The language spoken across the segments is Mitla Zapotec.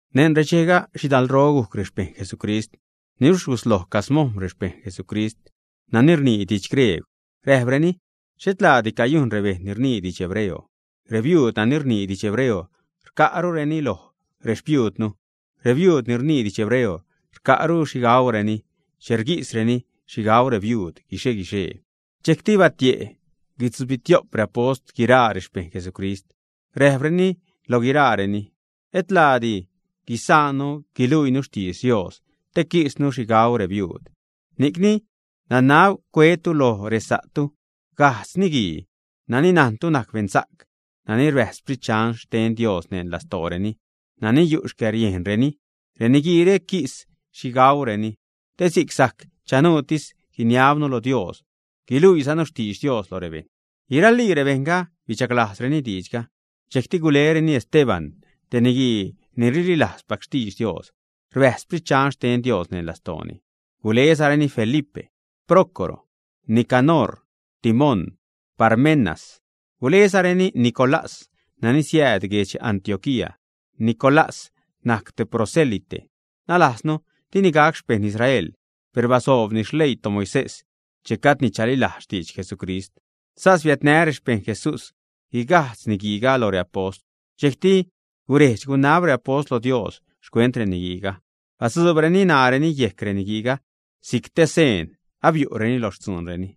Neṉ redxejga, xhidalro gujc rexpejṉ Jesucrist. Niluxh gusloj camojm̲ rexpejṉ Jesucrist nani rnii didx griegw. Räjpreni: ―Xhet laadi cayujn rebejṉ ni rnii didx hebreo. Rebiuud nani rnii didx hebreo rca'ru loj rexpiuudnu. Rebiuud ni rnii didx hebreo rca'ru xhi gaureni che rguisreni xhi gau rebiuud guixe-guixee. Dxejcti batie' guitzubitio'p reapost guiraa rexpejṉ Jesucrist, räjpreni lo guiraareni: ―Et laadi guisaannu guluiinu xtidx Dios te quisnu xhi gau rebiuud. Ni'c nanab cuetu lo resa'tu gajtz niguii nani najntu najc beṉsa'c, nani rbäjz Sprit Dxan xten Dios neṉ lastooreni, nani yu' xcäriejnreni. Reniguiire quis xhi gaureni. Te si'c sajc chanuutis guiniabnu lo Dios, guiluiizanu xtidx Dios lo rebejṉ. Guiralii rebejṉga bidxaglajzreni diidxga. Dxejcti gulereni Esteban, te niguii ni rlilajzpac xtidx Dios, rbäjzza Sprit Dxan xten Dios neṉ lastooni. Gulezareni Felipe, Prócoro, Nicanor, Timón, Parmenas; gulezareni Nicolás nani siääd guedx Antioquía. Nicolás najc te proselite, nalajznu, dini gac xpejṉ Israel, per basoobni xleii toMoisés che gajdni chalilajz xtidx Jesucrist. Sas biädnä rexpejṉ Jesús guigajtz niguiiga lo reapost. Dxejcti guredx-gunab reapost lo Dios xcuent reniguiiga, batzuubreni ṉaareni yejc reniguiiga si'c te seen abiu'reni lo xtzuunreni.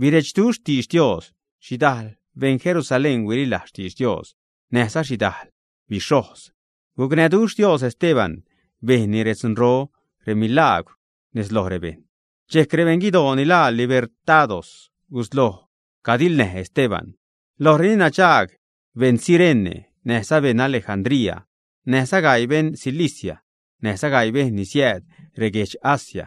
Birechduxh xtidx Dios. Xhidajl beṉ Jerusalén huililajz xtidx Dios, näjza xhidajl bixhojz. Gucnäduxh Dios Esteban, bejnni redzunro, remilagwr nez lo rebejṉ. Dxejc rebeṉ guidoo ni laa Libertados gusloj cadiḻnäj Esteban. Lojreni nadxaag beṉ Cirene, näjza beṉ Alejandría, näjza gaii beṉ Cilicia, näjza sgaii bejṉ ni siääd reguedx Asia.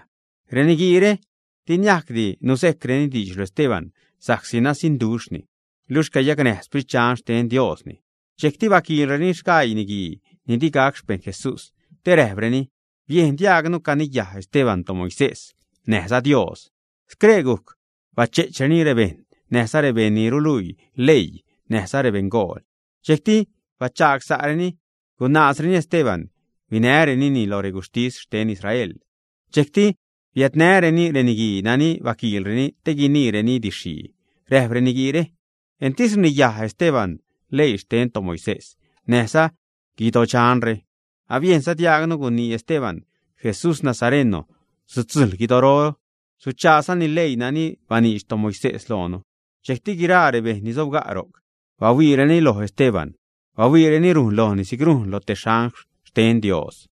Reniguiire di niajcdi nuzejcreni diidx lo Esteban, sa'csi nasiṉduxhni, luxh cayacnäj Sprit Dxan xten Diosni. Dxejcti baquiḻreni sgaii niguii ni di gac xpejṉ Jesús, te räjpreni: ―Biejn diaagnu caniyaj Esteban toMoisés näjza Dios. Scree gujc bache'chreni rebejṉ näjza rebejṉ ni ruluii leii näjza rebeṉgool. Dxejcti bachagsa'reni, gunaazreni Esteban. Huinärenini lo reguxhtis xten Israel. Dxejcti biädnäreni reniguii nani baquiḻreni te guniireni didx-xhii. Räjp reniguiire: ―Entis rniyaj Esteban leii xten toMoisés näjza guidodxanre. Abiejnza diaagnu gunii Esteban: “Jesús nazareno sutzujḻ guidoro, suchaazani leii nani baniidx toMoisés loonu.” Dxejcti guiraa rebejṉ ni sobga' ro'c bahuiireni lo Esteban, bahuiireni rujn lojni si'c rujn loj te angl xten Dios.